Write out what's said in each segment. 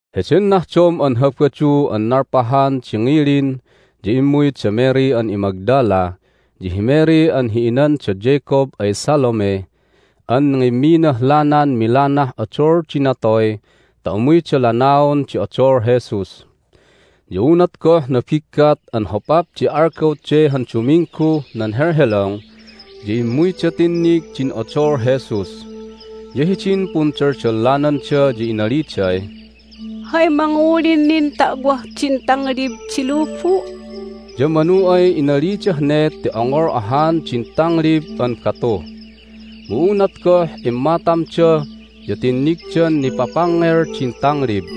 Heden nahdom an Habadu an nalpahan di ngilin ya immuy da Mary an iMagdala ya hi Mary an hi inan da Jacob ay Salome an ngimminah lanan milanah odol di natoy ta umuyda lanaon di odol Jesus. Ya unat goh nabiggat an hopap di algaw de han Dumingguh nan helhelong ya immuyda tinnig din odol Jesus. Ya hidin pundaldallananda ya inaliday, "Hay mangulin nin ta'wah din tanglib di lubu'?" Ya manu ay inalidah ne ti ongol ahan din tanglib an batu. Mu unat goh immatamda ya tinnigdan nipapangngel din tanglib.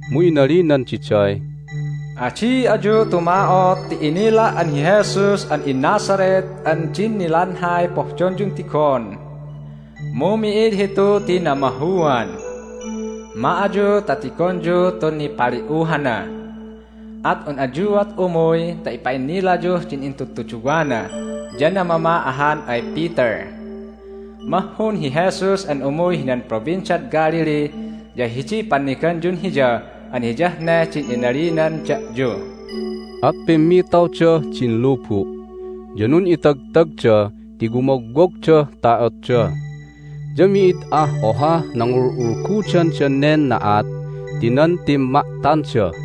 Mu inalinan diday, "Adi ayu tuma'ot ti inila' an hi Jesus an iNazareth an din nilanhay pohdonyun tigon. Mu mi'id hitu ti namahuan! Ma ayu ta tigonyu tun nipali'uhana. At un ayuat umuy ta ipa'innilayuh din intudtuduwana, ya namama ahan ay Peter: Mahhun hi Jesus an umuy hinan Provinciad Galilee, ya hidiy panniganyun Hiya an hiyah ne din inalinan da'yu." At pimmitawdah din lubu', ya nun'itagtagda ti wumogwogdah ta'otda. Ya mi'id ah ohah nangulgudandan nen na'at ti nan timma'tanda.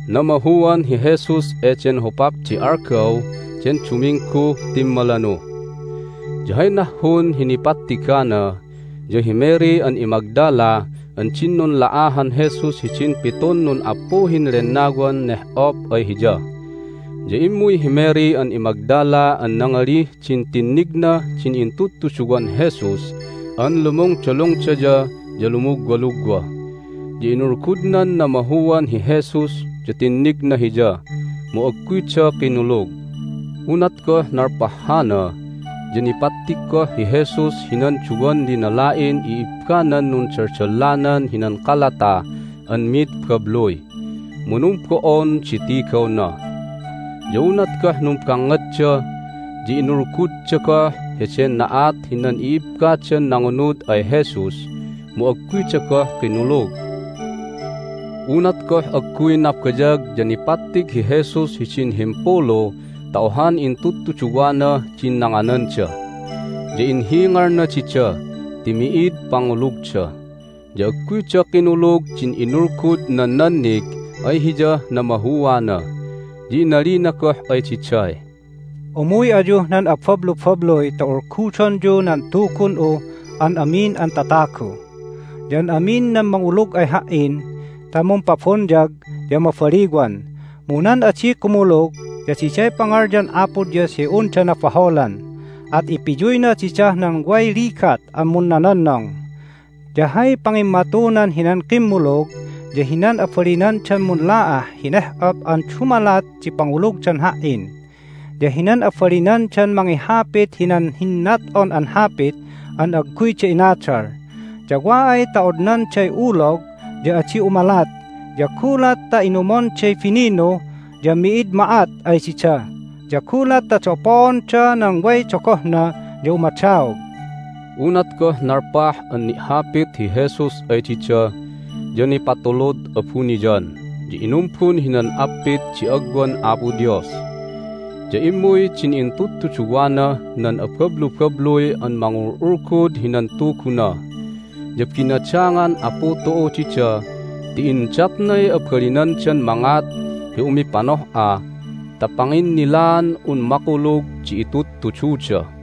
Namahuan hi Jesus eden hopap di algaw den Dumingguh timmalanu. Ya hay nahhun hi nipattigana ya hi Mary an iMagdala an din nunla'ahan Jesus hidin pitun nun'appuhin lennawan neh'op ay hiya. Ya immuy hi Mary an iMagdala an nangalih din tinnignah din intudtuduwan Jesus an lumungdalungdaya ya lumugwalugwa. Ya inulgudnan namahuan hi Jesus ya tinnigna Hiya. Mu agguyda kinulug. Unat goh nalpah hana ya nipattig goh hi Jesus hinan duwan linala'in i'ibbanan nundaldallanan hinan kalata an mid babluy, mu numbo'on di tigawna. Ya unat goh numbangngadda ya inulgudda goh heden na'at hinan i'ibbadan nangunud ay Jesus, mu agguyda goh kinulug. Unat goh agguy nabayag ya nipattig hi Jesus hidin himpulu ta ohan intudtuduwanah din nangananda. Ya inhingalna dida ti mi'id pangulugda, ya agguyda kinulug din inulgud nan nannig ay Hiyah namahuana. Ya inalina goh ay diday, "Umuy ayuh nan abablubabluy ta ulgudonyu nan Tugun'uh an amin an tatagu. Ya an amin nan mangulug ay Ha"in ta mumpabonyag ya mabaliwan. Mu nan adi kumulug ya diday pangalyan Apo Dios hi unda nabaholan, at ipiyuyna didah nan way ligat an munnononnong. Ya hay pangimmatunan hinan kimmulug ya hinan abalinandan munla'ah hi neh'op an dumalat di pangulugdan Ha"in, ya hinan abalinandan mangihapit hinan hinnat'on an hapit an agguyda inadal, ya wa ay ta odnanday ulog ya adi umalat, ya gulat ta inumonday bininu ya mi'id ma'at ay dida, ya gulat ta dapoonda nan way dogohna ya umadaog." Unat goh nalpah an ni'hapit hi Jesus ay dida ya nipatulud abuniyan, ya inumbun hinan appit di agwan Apo Dios. Ya immuy din intudtuduwanah nan abablubabluy an mangul'ulgud hinan Tuguna, ya binadangan Apu tu'u dida ti indatnay abalinandan mangat hi umipanoh'a ta panginnilaan un makulug di itudtududa.